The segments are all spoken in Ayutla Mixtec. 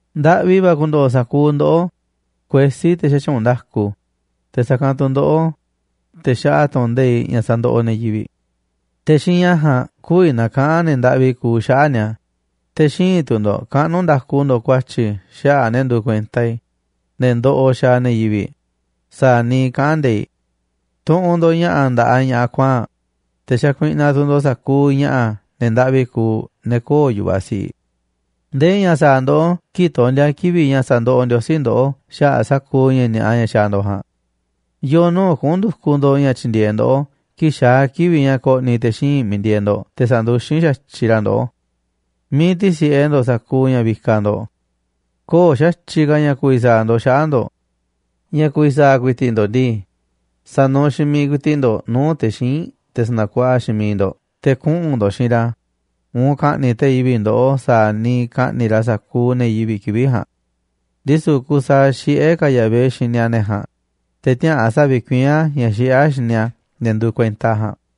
Ndaꞌvi va̱ ku̱ndo̱ꞌo̱ sa̱kuuꞌ ndoꞌó, kuesí, te̱ xätyuunꞌ nda̱ku, te̱ sa̱kanꞌ tu̱ ndoꞌó, te̱ xaꞌa tu̱ꞌu̱n nde̱iꞌ ña̱ sandoꞌoꞌ ne̱ yivi̱ꞌ. Te̱ xiinꞌ ña̱ ja̱a̱nꞌ kü̱vi̱ na̱kaꞌa̱n ne̱ ndaꞌvi kuuꞌ xaꞌa̱ꞌ ni̱a̱, te̱ xïinꞌ tu̱ ndo̱ꞌ kaꞌnu̱ nda̱ku ndo̱ꞌ ku̱a̱tyi̱ xaꞌa̱ꞌ ne̱ nduuꞌ kuenta i̱, ne̱ ndoꞌoꞌ xaaꞌ ne̱ yivi̱ꞌ sa̱a̱ niiꞌ kaꞌán nde̱iꞌ. Tuꞌunꞌ ndo̱ꞌ ña̱ꞌa̱ nda̱ꞌaꞌ ña̱ꞌaꞌ kuaa̱nꞌ, te̱ xakuiꞌnaꞌ tu̱ ndo̱ꞌ sa̱kuuꞌ ña̱ꞌaꞌ ne̱ ndaꞌvi kuuꞌ, ne̱ köo̱ꞌ yu̱vaꞌ si̱ꞌiꞌ. ¿Ndee ña̱ sa̱a̱ ndoꞌó kii̱ꞌ tondi̱a̱ kivi̱ꞌ ña̱ sa̱ndoꞌoꞌ Ndiosí ndoꞌó xaꞌa̱ꞌ sa̱kuuꞌ ña̱ ni̱a̱ꞌa ña̱ xaaꞌ ndo̱ꞌ ja̱a̱nꞌ? ¿Yo̱o̱ nuu̱ꞌ kuꞌu̱n ndu̱kuꞌ ndo̱ꞌ ña̱ tyi̱ndi̱e̱eꞌ ndoꞌó kii̱ꞌ xaa̱ kivi̱ꞌ ña̱ ko̱ꞌni̱ te̱ xíinꞌ miiꞌ ndieeꞌ ndo̱ꞌ te̱ sa̱nduxín xa̱tyiꞌ ra̱ ndoꞌó? ¿Miiꞌ ti̱si̱ꞌe ndo̱ꞌ sa̱kuuꞌ ña̱ vikaꞌ ndo̱ꞌ? Köo̱ꞌ xa̱tyiꞌ ka̱ ña̱ ku̱vi̱ sa̱a̱ ndo̱ꞌ xaꞌa̱ꞌ ndo̱ꞌ. Ña̱ ku̱vi̱ sa̱a̱ ku̱i̱ti̱ꞌ ndo̱ꞌ ndii, sa̱nuuꞌ xiinꞌ miiꞌ ku̱i̱ti̱ꞌ ndo̱ꞌ nuu̱ꞌ te̱ xíinꞌ, te̱ sa̱na̱kuaꞌaꞌ xiinꞌ miiꞌ ndo̱ꞌ, te̱ kuꞌu̱n ndo̱ꞌ xiinꞌ ra̱ uun ka̱ꞌni̱ꞌ te̱ yivi̱ꞌ ndoꞌó sa̱a̱ niiꞌ ka̱ꞌni̱ꞌ ra̱ sa̱kuuꞌ ne̱ yivi̱ꞌ kivi̱ꞌ ja̱a̱nꞌ. Ndisu̱ kusaaꞌ xiꞌé ka̱ Yahvé xini a̱ ne̱ ja̱a̱nꞌ, te̱ tiäꞌa̱an sa̱vi̱kuiín a̱ ña̱ xiꞌé a̱ xini a̱ ne̱ nduuꞌ kuenta a̱ ja̱a̱nꞌ.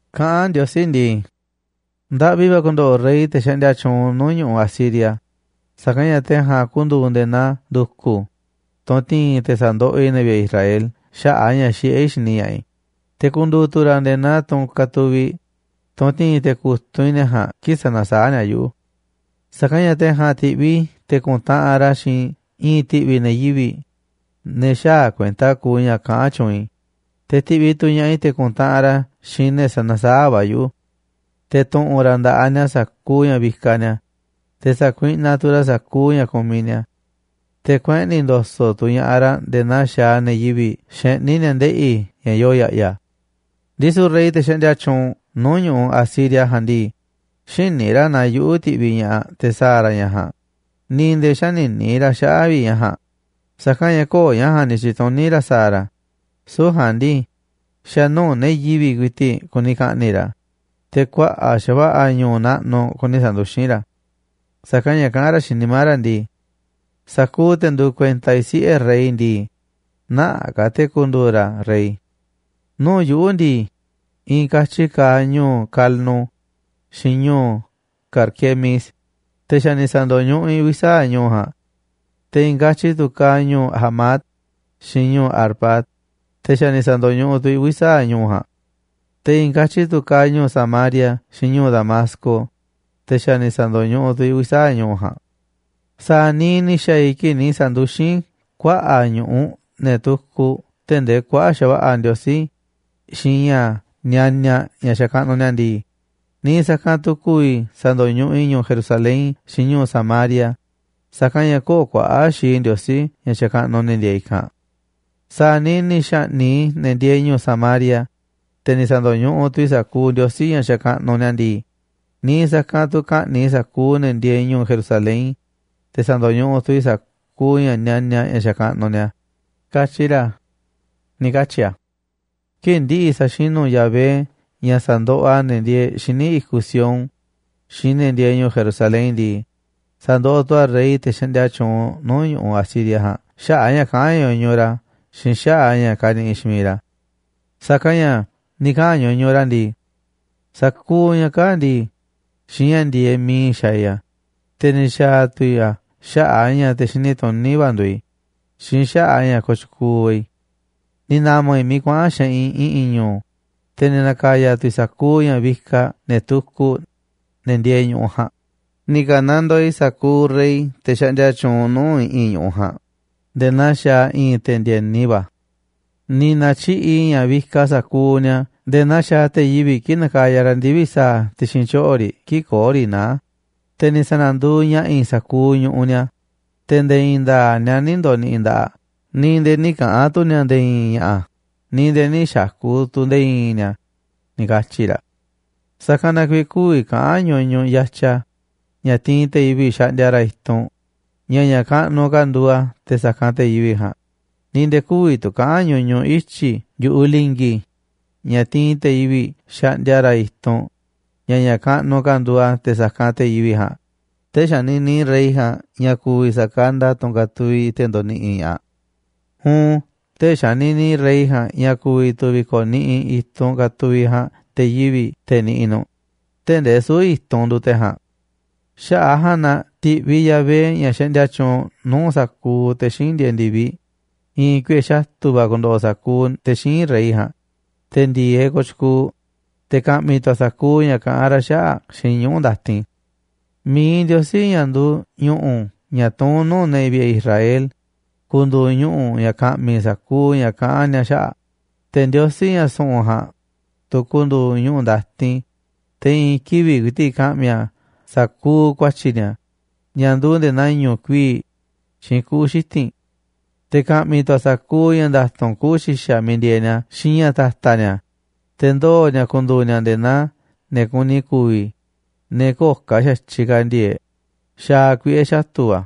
Kaꞌán Ndiosí ndii: “Ndaꞌvi va̱ ku̱ndo̱ꞌo̱ rey, te̱ xaꞌndia tyuunꞌ nuu̱ꞌ ñu̱ꞌuꞌ Asiria, sa̱kanꞌ ña̱ te̱ ja̱a̱nꞌ ku̱ndu̱u̱ nde̱e̱ naa ndu̱ku̱, tunꞌ ti̱i̱n i̱ te̱ sa̱ndoꞌoꞌ i̱ ne̱ vi̱ꞌe̱ Israel xaꞌa̱ꞌ a̱ ña̱ xiꞌé i̱ xini ña̱ꞌaꞌ i̱, te̱ ku̱ndu̱u̱ tu̱ ra̱ nde̱e̱ naa tunꞌ katuviꞌ i̱, tunꞌ ti̱i̱n i̱ te̱ ku̱tunꞌ i̱ ne̱ ja̱a̱nꞌ kii̱ꞌ sanasaáꞌ ni̱a̱ yuꞌu̱. Sa̱kanꞌ ña̱ te̱ ja̱a̱nꞌ ti̱ꞌviꞌ i̱ te̱ ku̱ntaꞌanꞌ ra̱ xiinꞌ i̱i̱n ti̱ꞌvi̱ ne̱ yivi̱ꞌ, ne̱ xäaꞌ kuenta kuuꞌ ña̱ kaꞌán tyuunꞌ i̱, te̱ ti̱ꞌviꞌ tu̱ ña̱ꞌaꞌ i̱ te̱ ku̱ntaꞌanꞌ ra̱ xiinꞌ ne̱ sanasaáꞌ va̱ yuꞌu̱. Te̱ tu̱ꞌu̱n ra̱ nda̱ꞌaꞌ ni̱a̱ sa̱kuuꞌ ña̱ vikaꞌ ni̱a̱, te̱ sa̱kuiꞌnaꞌ tu̱ ra̱ sa̱kuuꞌ ña̱ kumiꞌ ni̱a̱. Te̱ kueꞌni̱ ndo̱so̱ꞌ tu̱ ña̱ꞌaꞌ ra̱ nde̱e̱ naa xaaꞌ ne̱ yivi̱ꞌ xeꞌní ni̱a̱ ndeꞌi̱ ña̱ yoo ya̱ꞌya̱. Ndisu̱ rey, te̱ xaꞌndia tyuunꞌ nuu̱ꞌ ñu̱ꞌuꞌ Asiria ja̱a̱nꞌ ndii, xïní ra̱ naa yuꞌu̱ tiꞌviꞌ ña̱ꞌaꞌ te̱ sa̱a̱ ra̱ ña̱ ja̱a̱nꞌ, ni̱ nde̱e̱ nï̱ xanini ra̱ xaꞌa̱ꞌ vi̱ꞌ ña̱ ja̱a̱nꞌ, sa̱kanꞌ ña̱ köo̱ꞌ ña̱ ja̱a̱nꞌ ni̱ tyi̱tuní ra̱ sa̱a̱ ra̱. Süu̱ꞌ ja̱a̱nꞌ ndii, xa̱ nuu̱ꞌ ne̱ yivi̱ꞌ ku̱i̱ti̱ꞌ kuni ka̱ꞌni̱ꞌ ra̱, te̱ kuaꞌa̱ꞌ xa̱va̱ꞌa̱ ñu̱u̱ naꞌnuꞌ kuni sa̱nduxín ra̱. Sa̱kanꞌ ña̱ kaꞌán ra̱ xiinꞌ nimá ra̱ ndii: Sa̱kuuꞌ te̱ nduuꞌ kuenta i̱ siꞌe̱ rey ndii, nä̱ꞌaꞌ ka̱ te̱ ku̱ndu̱u̱ ra̱ rey. Nuu̱ꞌ yuꞌu̱ ndii, i̱i̱n katyi kaaꞌ ñu̱u̱ Calno xiinꞌ ñu̱u̱ Carquemis, te̱ xa̱ ni̱ sa̱ndo̱ñuꞌuꞌ i̱ uvi̱ sa̱aꞌ ñu̱u̱ ja̱a̱nꞌ. Te̱ i̱i̱n katyi tu̱ kaaꞌ ñu̱u̱ Hamat xiinꞌ ñu̱u̱ Arfad, te̱ xa̱ ni̱ sa̱ndo̱ñuꞌuꞌ tu̱ i̱ uvi̱ sa̱aꞌ ñu̱u̱ ja̱a̱nꞌ. Te̱ i̱i̱n katyi tu̱ kaaꞌ ñu̱u̱ Samaria xiinꞌ ñu̱u̱ Damasco, te̱ xa̱ ni̱ sa̱ndo̱ñuꞌuꞌ tu̱ i̱ uvi̱ sa̱aꞌ ñu̱u̱ ja̱a̱nꞌ. Sa̱a̱ niiꞌ ni̱ xa̱a̱ i̱ kii̱ꞌ ni̱ sa̱nduxín i̱ kuaꞌa̱ꞌ ñu̱ꞌuꞌ ne̱ tukuꞌ tee̱ꞌ ndee kuaꞌa̱ꞌ xa̱va̱ꞌa̱ ndiosí xiinꞌ ña̱ nianiaꞌ ña̱ xakaꞌnuꞌ ni̱a̱ ndii, niiꞌ sa̱kanꞌ tu̱ ku̱vi̱ tu̱ sa̱ndo̱ñuꞌuꞌ i̱ ñu̱u̱ Jerusalén xiinꞌ ñu̱u̱ Samaria, sa̱kanꞌ ña̱ köo̱ꞌ kuaꞌa̱ꞌ xii ndiosí ña̱ xakaꞌnuꞌ ne̱ ndieeꞌ i̱kanꞌ. Sa̱a̱ niiꞌ ni̱ xa̱ꞌni̱ꞌ i̱ ne̱ ndieeꞌ ñu̱u̱ Samaria, te̱ ni̱ sa̱ndo̱ñuꞌuꞌ tu̱ i̱ sa̱kuuꞌ ndiosí ña̱ xakaꞌnuꞌ ni̱a̱ ndii, niiꞌ sa̱kanꞌ tu̱ ka̱ꞌni̱ꞌ i̱ sa̱kuuꞌ ne̱ ndieeꞌ ñu̱u̱ Jerusalén, te̱ sa̱ndo̱ñuꞌuꞌ tu̱ i̱ sa̱kuuꞌ ña̱ nianiaꞌ ña̱ xakaꞌnuꞌ ni̱a̱, katyi ra̱”, ni̱ katyi a̱. Kii̱ꞌ ndi̱ꞌi̱ sa̱xinu̱ Yahvé ña̱ sa̱ndoꞌoꞌ a̱ ne̱ ndieeꞌ xíniꞌ i̱kuꞌ Sión xiinꞌ ne̱ ndieeꞌ ñu̱u̱ Jerusalén ndii, sa̱ndoꞌoꞌ tu̱ a̱ rey, te̱ xaꞌndia tyuunꞌ nuu̱ꞌ ñu̱ꞌuꞌ Asiria ja̱a̱nꞌ, xaꞌa̱ꞌ a̱ ña̱ kaꞌán ñuñuꞌ ra̱ xiinꞌ xaꞌa̱ꞌ a̱ ña̱ kaniꞌiꞌ xiinꞌ miiꞌ ra̱. Sa̱kanꞌ ña̱ ni̱ kaꞌa̱n ñuñuꞌ ra̱ ndii: “Sa̱kuuꞌ ña̱ kaa̱ꞌ ndii, xiinꞌ ña̱ ndi̱e̱eꞌ miiꞌ i̱ xa̱a̱ i̱ a̱, te̱ ni̱ xa̱a̱ tu̱ i̱ a̱ xaꞌa̱ꞌ a̱ ña̱ te̱ xini tuní va̱ nduuꞌ i̱ xiinꞌ xaꞌa̱ꞌ a̱ ña̱ kooꞌ tyukuuꞌ va̱ i̱. Ni̱ na̱ma̱ i̱ miiꞌ kuaꞌa̱n xeꞌinꞌ i̱ꞌi̱n ñu̱u̱, te̱ ni̱ na̱ka̱ya̱ tu̱ i̱ sa̱kuuꞌ ña̱ vikaꞌ ne̱ tukuꞌ, ne̱ ndieeꞌ ñu̱ꞌuꞌ ja̱a̱nꞌ. Ni̱ ka̱nandoo i̱ sa̱kuuꞌ rey, te̱ xaꞌndia tyuunꞌ nuu̱ꞌ i̱ꞌi̱n ñu̱ꞌuꞌ ja̱a̱nꞌ nde̱e̱ naa xaaꞌ i̱i̱n te̱ ndi̱e̱ni va̱. Ni̱ na̱tyiꞌi̱ꞌ i̱ ña̱ vikaꞌ sa̱kuuꞌ ni̱a̱ nde̱e̱ naa xaaꞌ te̱ yivi̱ꞌ kii̱ꞌ nakaya ra̱ ndivi̱ꞌ sa̱a̱ ti̱xi̱n tyoꞌo̱ riꞌ kii̱ꞌ köo̱ꞌ riꞌ naá, te̱ ni̱ sa̱na̱nduuꞌ ña̱ꞌa̱ i̱ sa̱kuuꞌ ñu̱ꞌuꞌ ni̱a̱, te̱ nde̱e̱ i̱i̱n nda̱a̱ꞌ ni̱a̱ nï̱ ndo̱ni̱ꞌi̱ nda̱ꞌaꞌ, ni̱ nde̱e̱ nï̱ kaꞌa̱n tu̱ ni̱a̱ nde̱e̱ i̱i̱n ña̱ꞌa̱, ni̱ nde̱e̱ nï̱ xa̱ku̱ tu̱ nde̱e̱ i̱i̱n ni̱a̱”, ni̱ katyi̱ ra̱. Sa̱kanꞌ na kuiiꞌ kü̱vi̱ kaꞌa̱n ñuñuꞌ yatya, ña̱ tiinꞌ te̱ yivi̱ꞌ xaꞌndia ra̱ i̱tunꞌ, ña̱ ña̱ kaꞌnuꞌ ka̱ nduuꞌ a̱ te̱ sa̱kanꞌ te̱ yivi̱ꞌ ja̱a̱nꞌ, ni̱ nde̱e̱ kü̱vi̱ tu̱ kaꞌa̱n ñuñuꞌ ityi̱ yu̱ꞌuꞌ li̱ngi̱, ña̱ tiinꞌ te̱ yivi̱ꞌ xaꞌndia ra̱ i̱tunꞌ, ña̱ ña̱ kaꞌnuꞌ ka̱ nduuꞌ a̱ te̱ sa̱kanꞌ te̱ yivi̱ꞌ ja̱a̱nꞌ. Tee̱ꞌ xanini rey ja̱a̱nꞌ ña̱ ku̱vi̱ sa̱kanda tunꞌ katuviꞌ te̱ ndoniꞌiꞌ ña̱ꞌaꞌ uun tee̱ꞌ xanini rey ja̱a̱nꞌ ña̱ ku̱vi̱ tu̱ vi̱ko̱niꞌiꞌ i̱tunꞌ katuviꞌ ja̱a̱nꞌ te̱ yivi̱ꞌ, te̱ niꞌiꞌ nu̱ꞌ, tee̱ꞌ ndee süu̱ꞌ i̱tunꞌ nduuꞌ te̱ ja̱a̱nꞌ. Xaꞌa̱ꞌ a̱ ja̱a̱nꞌ na ti̱ꞌviꞌ Yahvé, ña̱ xaꞌndia tyuunꞌ nuu̱ꞌ sa̱kuuꞌ te̱ xíinꞌ ndieeꞌ ndi̱viꞌ, i̱i̱n kuiꞌe̱ xatu̱ va̱ ku̱ndo̱ꞌo̱ sa̱kuuꞌ te̱ xíinꞌ rey ja̱a̱nꞌ, te̱ ndi̱e̱eꞌ kooꞌ tyukuuꞌ, te̱ ka̱ꞌmi̱ tu̱ a̱ sa̱kuuꞌ ña̱ kaꞌán ra̱ xaꞌa̱ꞌ xiinꞌ ñuꞌu̱ ndatin. Mi̱iꞌ Ndiosí, ña̱ nduuꞌ ñu̱ꞌu̱ ña̱ tuún nuu̱ꞌ ne̱ vi̱ꞌe̱ Israel, ku̱ndu̱u̱ ñuꞌu̱ ña̱ ka̱ꞌmi̱ sa̱kuuꞌ ña̱ kaꞌán ni̱a̱ xaꞌa̱ꞌ, te̱ Ndiosí, ña̱ su̱ꞌu̱n ja̱a̱nꞌ, tu̱ ku̱ndu̱u̱ ñuꞌu̱ ndatin, te̱ i̱i̱n kivi̱ꞌ ku̱i̱ti̱ꞌ ka̱ꞌmi̱ a̱ sa̱kuuꞌ ku̱a̱tyi̱ ni̱a̱ ña̱ nduuꞌ nde̱e̱ naa i̱ñu̱ꞌ kuii̱ꞌ xiinꞌ kuꞌu̱ xiti̱nꞌ. Te̱ ka̱ꞌmi̱ tu̱ a̱ sa̱kuuꞌ ña̱ nda̱tu̱nꞌ kuꞌu̱ xi̱xa̱ miiꞌ ndieeꞌ ni̱a̱ xiinꞌ ña̱ ta̱ta̱ ni̱a̱, te̱ ndoo̱ ni̱a̱ ku̱ndu̱u̱ ni̱a̱ nde̱e̱ naa ne̱ kuni ku̱vi̱, ne̱ köo̱ꞌ ka̱ xa̱tyiꞌ ka̱ ndi̱e̱e̱ꞌ, xaaꞌ kuiꞌe̱ xatu̱ va̱.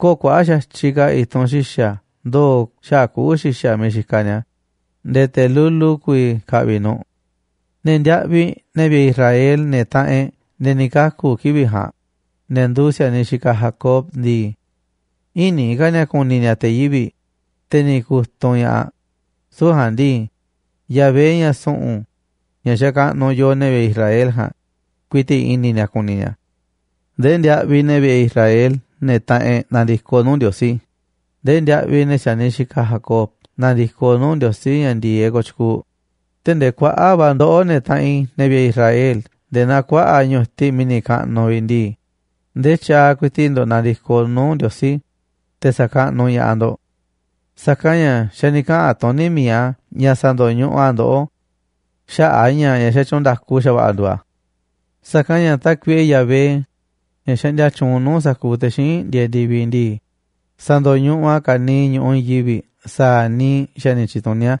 Köo̱ꞌ kuaꞌa̱ꞌ xa̱tyiꞌ ka̱ i̱tunꞌ xi̱xa̱ ndoo̱ xaꞌa̱ꞌ kuꞌu̱ xi̱xa̱ miiꞌ xikaꞌ ni̱a̱ nde̱e̱ te̱ lulu ku̱vi̱ ka̱ꞌvi̱ nu̱ꞌ. Ne̱ ndiaꞌviꞌ, ne̱ vi̱ꞌe̱ Israel, ne̱ taꞌanꞌ e̱ꞌ, ne̱ ni̱ kaku̱ kivi̱ꞌ ja̱a̱nꞌ, ne̱ nduuꞌ si̱a̱niꞌ xikaꞌ Jacob ndii, ï̱ni̱ ka̱ ni̱a̱ ku̱ni̱ ni̱a̱ te̱ yivi̱ꞌ, te̱ ni̱ ku̱tunꞌ ña̱ꞌaꞌ. Süu̱ꞌ ja̱a̱nꞌ ndii, Yahvé, ña̱ su̱ꞌu̱n, ña̱ xakaꞌnuꞌ yooꞌ, ne̱ vi̱ꞌe̱ Israel ja̱a̱nꞌ, ku̱i̱ti̱ꞌ i̱ni̱ ni̱a̱ ku̱ni̱ ni̱a̱. Ndee ndiaꞌviꞌ ne̱ vi̱ꞌe̱ Israel, ne̱ taꞌanꞌ e̱ꞌ, na̱ndi̱koꞌ nuu̱ꞌ Ndiosí, ndee ndiaꞌviꞌ ne̱ si̱a̱niꞌ xikaꞌ Jacob na̱ndi̱koꞌ nuu̱ꞌ Ndiosí, ña̱ ndi̱e̱eꞌ kooꞌ tyukuuꞌ. Tee̱ꞌ ndee kuaꞌa̱ꞌ va̱ ndoꞌó, ne̱ taꞌanꞌ i̱, ne̱ vi̱ꞌe̱ Israel, nde̱e̱ naa kuaꞌa̱ꞌ ñu̱tiꞌ mi̱ni̱ kaꞌnuꞌ vi̱ꞌ ndii, ndee tyaaꞌ ku̱i̱ti̱ꞌ ndo̱ꞌ na̱ndi̱koꞌ nuu̱ꞌ Ndiosí, te̱ sa̱kaꞌnuꞌ ña̱ꞌaꞌ ndo̱ꞌ. Sa̱kanꞌ ña̱ xa̱ ni̱ kaꞌa̱n tuní mi̱iꞌ a̱ ña̱ sa̱ndo̱ñuꞌuꞌ a̱ ndoꞌó xaꞌa̱ꞌ a̱ ña̱ ña̱ xatyuunꞌ nda̱ku xa̱va̱ꞌa̱ nduuꞌ a̱. Sa̱kanꞌ ña̱ Tákuiꞌe Yahvé, ña̱ xaꞌndia tyuunꞌ nuu̱ꞌ sa̱kuuꞌ te̱ xíinꞌ ndieeꞌ ndi̱viꞌ ndii, sa̱ndo̱ñuꞌuꞌ a̱ ka̱niiꞌ ñu̱ꞌuꞌ i̱i̱n yivi̱ꞌ sa̱a̱ niiꞌ xa̱ ni̱ tyi̱tuní a̱.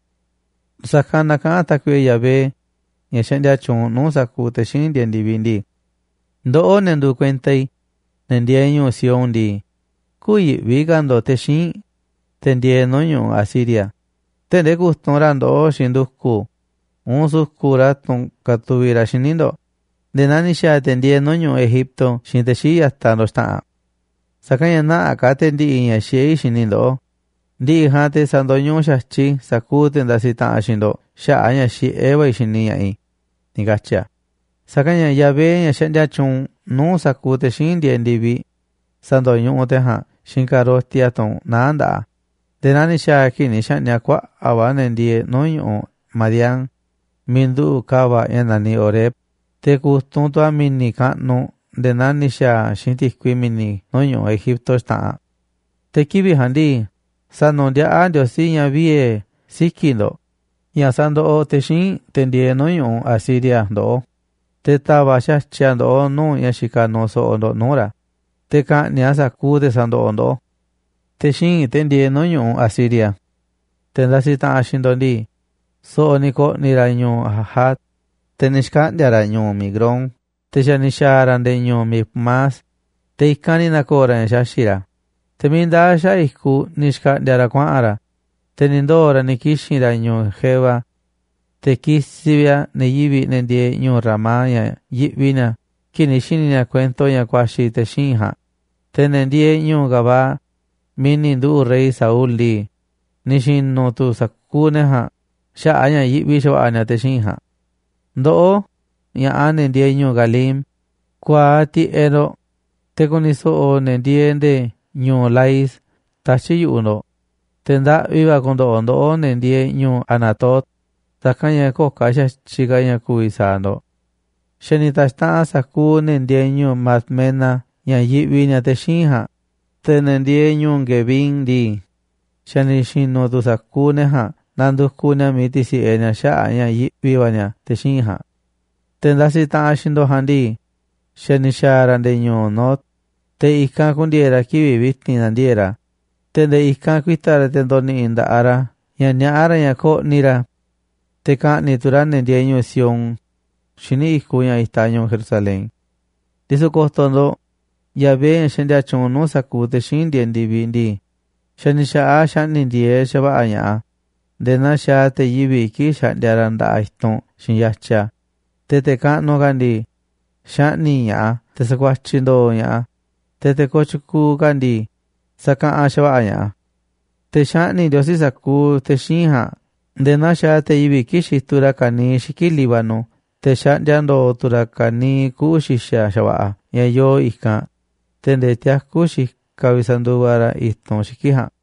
Sa̱kanꞌ na kaꞌán Tákuiꞌe Yahvé, ña̱ xaꞌndia tyuunꞌ nuu̱ꞌ sa̱kuuꞌ te̱ xíinꞌ ndieeꞌ ndi̱viꞌ ndii: “Ndoꞌó, ne̱ nduuꞌ kuenta i̱, ne̱ ndieeꞌ ñu̱u̱ Sión ndii, kü̱yi̱ꞌvi ka̱ ndo̱ꞌ te̱ xíinꞌ, te̱ ndieeꞌ nuu̱ꞌ ñu̱ꞌuꞌ Asiria, tee̱ꞌ ndee ku̱tunꞌ ra̱ ndoꞌó xiinꞌ ndu̱ku̱ uun su̱ku̱ꞌ ra̱ tunꞌ katuviꞌ ra̱ xíniꞌ ndo̱ꞌ nde̱e̱ naa ni̱ xa̱a̱ te̱ ndieeꞌ nuu̱ꞌ ñu̱ꞌuꞌ Egipto xiinꞌ te̱ xii̱ꞌ ya̱taꞌ ndo̱ꞌ xta̱ꞌanꞌ. Sa̱kanꞌ ña̱ nä̱ꞌaꞌ ka̱ te̱ ndi̱ꞌi̱ ña̱ xiꞌé i̱ xini i̱ ndoꞌó, ndi̱ꞌi̱ ja̱a̱nꞌ te̱ sa̱ndo̱ñuꞌuꞌ xa̱tyiꞌ i̱ sa̱kuuꞌ te̱ ndasiꞌ taꞌanꞌ xiinꞌ ndo̱ꞌ xaꞌa̱ꞌ a̱ ña̱ xiꞌé va̱ i̱ xini ña̱ꞌaꞌ i̱”, ni̱ katyi̱ a̱. Sa̱kanꞌ ña̱ Yahvé, ña̱ xaꞌndia tyuunꞌ nuu̱ꞌ sa̱kuuꞌ te̱ xíinꞌ ndieeꞌ ndi̱viꞌ, sa̱ndo̱ñuꞌuꞌ te̱ jaa̱nꞌ xiinꞌ ka̱roti a̱ tunꞌ naá nda̱ꞌaꞌ a̱ nde̱e̱ naa ni̱ xa̱a̱ a̱ kii̱ꞌ ni̱ xa̱ꞌni̱ꞌ a̱ kuaꞌa̱ꞌ va̱ ne̱ ndieeꞌ nuu̱ꞌ ñu̱ꞌuꞌ Madián miiꞌ nduꞌu̱ꞌ ka̱va̱ꞌ ña̱ naniꞌ Oreb, te̱ ku̱tunꞌ tu̱ a̱ mi̱ni̱ kaꞌnuꞌ nde̱e̱ naa ni̱ xa̱a̱ a̱ xiinꞌ ti̱kui mi̱ni̱ nuu̱ꞌ ñu̱ꞌuꞌ Egipto xta̱ꞌanꞌ. Te̱ kivi̱ꞌ ja̱a̱nꞌ ndii, sa̱nu̱ndiaꞌá Ndiosí ña̱ viee̱ siki̱ꞌ ndo̱ꞌ ña̱ sandoꞌoꞌ te̱ xíinꞌ te̱ ndieeꞌ nuu̱ꞌ ñu̱ꞌuꞌ Asiria ndoꞌó, te̱ ta̱va̱ꞌ xa̱tyiꞌ a̱ ndoꞌó nuu̱ꞌ ña̱ xikaꞌ nuuꞌ so̱ꞌo̱ ndo̱ꞌ nuu̱ꞌ ra̱, te̱ ka̱ꞌni̱ꞌ a̱ sa̱kuuꞌ te̱ sandoꞌoꞌ ndoꞌó. Te̱ xíinꞌ, te̱ ndieeꞌ nuu̱ꞌ ñu̱ꞌuꞌ Asiria, te̱ ndasiꞌ taꞌanꞌ xiinꞌ ndo̱ꞌ ndii, so̱ꞌo̱ ni̱ ko̱ꞌni̱ ra̱ ñu̱u̱ Ajat, te̱ ni̱ xkaꞌndi̱a̱ ra̱ ñu̱u̱ Migrón, te̱ xa̱ ni̱ xa̱a̱ ra̱ nde̱e̱ ñu̱u̱ Micmás, te̱ i̱kanꞌ ni̱ na̱ko̱o̱ ra̱ ña̱ xaxi̱ꞌ ra̱. Te̱ miiꞌ ndaa̱ xaꞌa̱ꞌ i̱kuꞌ ni̱ xkaꞌndi̱a̱ ra̱ kuaꞌa̱n ra̱, te̱ ni̱ ndoo̱ ra̱ ni̱ kixi̱n ra̱ ñu̱u̱ Geba. Te̱ kisiꞌ vi̱ꞌ a̱ ne̱ yivi̱ꞌ, ne̱ ndieeꞌ ñu̱u̱ Ramá, ña̱ yiꞌvi ni̱a̱ kii̱ꞌ ni̱ xi̱ni̱ ni̱a̱ kuento ña̱ ku̱a̱xi̱ te̱ xíinꞌ ja̱a̱nꞌ, te̱ ne̱ ndieeꞌ ñu̱u̱ Gabaa, miiꞌ ni̱ nduꞌu̱ rey Saul ndii, ni̱ xi̱nu̱ tu̱ sa̱kuuꞌ ne̱ ja̱a̱nꞌ xaꞌa̱ꞌ a̱ ña̱ yiꞌvi xa̱va̱ꞌa̱ ni̱a̱ te̱ xíinꞌ ja̱a̱nꞌ. Ndoꞌó ña̱ꞌaꞌ, ne̱ ndieeꞌ ñu̱u̱ Galim, ku̱a̱aꞌ tiꞌeꞌ ndo̱ꞌ, te̱ ku̱ni̱ so̱ꞌo̱ ne̱ ndieeꞌ nde̱e̱ ñu̱u̱ Lais tatyi̱ꞌ yu̱ꞌuꞌ ndo̱ꞌ, te̱ ndaꞌvi va̱ ku̱ndo̱ꞌo̱ ndoꞌó ne̱ ndieeꞌ ñu̱u̱ Anatot, sa̱kanꞌ ña̱ köo̱ꞌ ka̱ xa̱tyiꞌ ka̱ ña̱ ku̱vi̱ sa̱a̱ ndo̱ꞌ. Xa̱ ni̱ ta̱xtaꞌanꞌ sa̱kuuꞌ ne̱ ndieeꞌ ñu̱u̱ Madmena ña̱ yiꞌvi ni̱a̱ te̱ xíinꞌ ja̱a̱nꞌ, te̱ ne̱ ndieeꞌ ñu̱u̱ Gebim ndii, xa̱ ni̱ xi̱nu̱ tu̱ sa̱kuuꞌ ne̱ ja̱a̱nꞌ nandukuꞌ ni̱a̱ miiꞌ ti̱si̱ꞌe ni̱a̱ xaꞌa̱ꞌ a̱ ña̱ yiꞌvi va̱ ni̱a̱ te̱ xíinꞌ ja̱a̱nꞌ. Te̱ ndasiꞌ taꞌanꞌ xiinꞌ ndo̱ꞌ ja̱a̱nꞌ ndii, xa̱ ni̱ xa̱a̱ ra̱ nde̱e̱ ñu̱u̱ Nob, te̱ i̱kanꞌ ku̱ndi̱e̱e̱ ra̱ kivi̱ꞌ vi̱ti̱n na̱ndiee̱ꞌ ra̱, te̱ nde̱e̱ i̱kanꞌ ku̱i̱ta̱ ra̱, te̱ ndo̱ni̱ꞌi̱ nda̱ꞌaꞌ ra̱ ña̱ niaꞌá ra̱ ña̱ ko̱ꞌni̱ ra̱ te̱ ka̱ꞌni̱ꞌ tu̱ ra̱ ne̱ ndieeꞌ ñu̱u̱ Sión, xíniꞌ i̱kuꞌ ña̱ itaꞌ ñu̱u̱ Jerusalén. Ndisu̱ ko̱to̱ ndo̱ꞌ, Yahvé, ña̱ xaꞌndia tyuunꞌ nuu̱ꞌ sa̱kuuꞌ te̱ xíinꞌ ndieeꞌ ndi̱viꞌ ndii, xa̱ ni̱ xa̱ꞌaꞌ a̱ xaꞌni̱ꞌ ndi̱e̱eꞌ xa̱va̱ꞌa̱ ña̱ꞌaꞌ a̱ nde̱e̱ naa xaaꞌ te̱ yivi̱ꞌ kii̱ꞌ xaꞌndia ra̱ nda̱ꞌaꞌ i̱tunꞌ xiinꞌ yatya. Te̱ te̱ kaꞌnuꞌ ka̱ ndii, xaꞌni̱ꞌ ña̱ꞌaꞌ a̱ te̱ sakuatyiꞌ ndooꞌ ña̱ꞌaꞌ a̱, te̱ te̱ kooꞌ tyukuuꞌ ka̱ ndii, sa̱kaꞌanꞌ xa̱va̱ꞌa̱ ña̱ꞌaꞌ a̱. Te̱ xaꞌni̱ꞌ Ndiosí sa̱kuuꞌ te̱ xíinꞌ ja̱a̱nꞌ nde̱e̱ naa xaaꞌ te̱ yivi̱ꞌ kii̱ꞌ xituꞌ ra̱ ka̱niiꞌ xiki̱ꞌ Líbano, te̱ xaꞌndia ndo̱o̱ tu̱ ra̱ ka̱niiꞌ kuꞌu̱ xi̱xa̱ xa̱va̱ꞌa̱ ña̱ yoo i̱kanꞌ te̱ nde̱e̱ tiakú xikaꞌ vi̱ꞌ sanduva ra̱ i̱tunꞌ xiki̱ꞌ ja̱a̱nꞌ.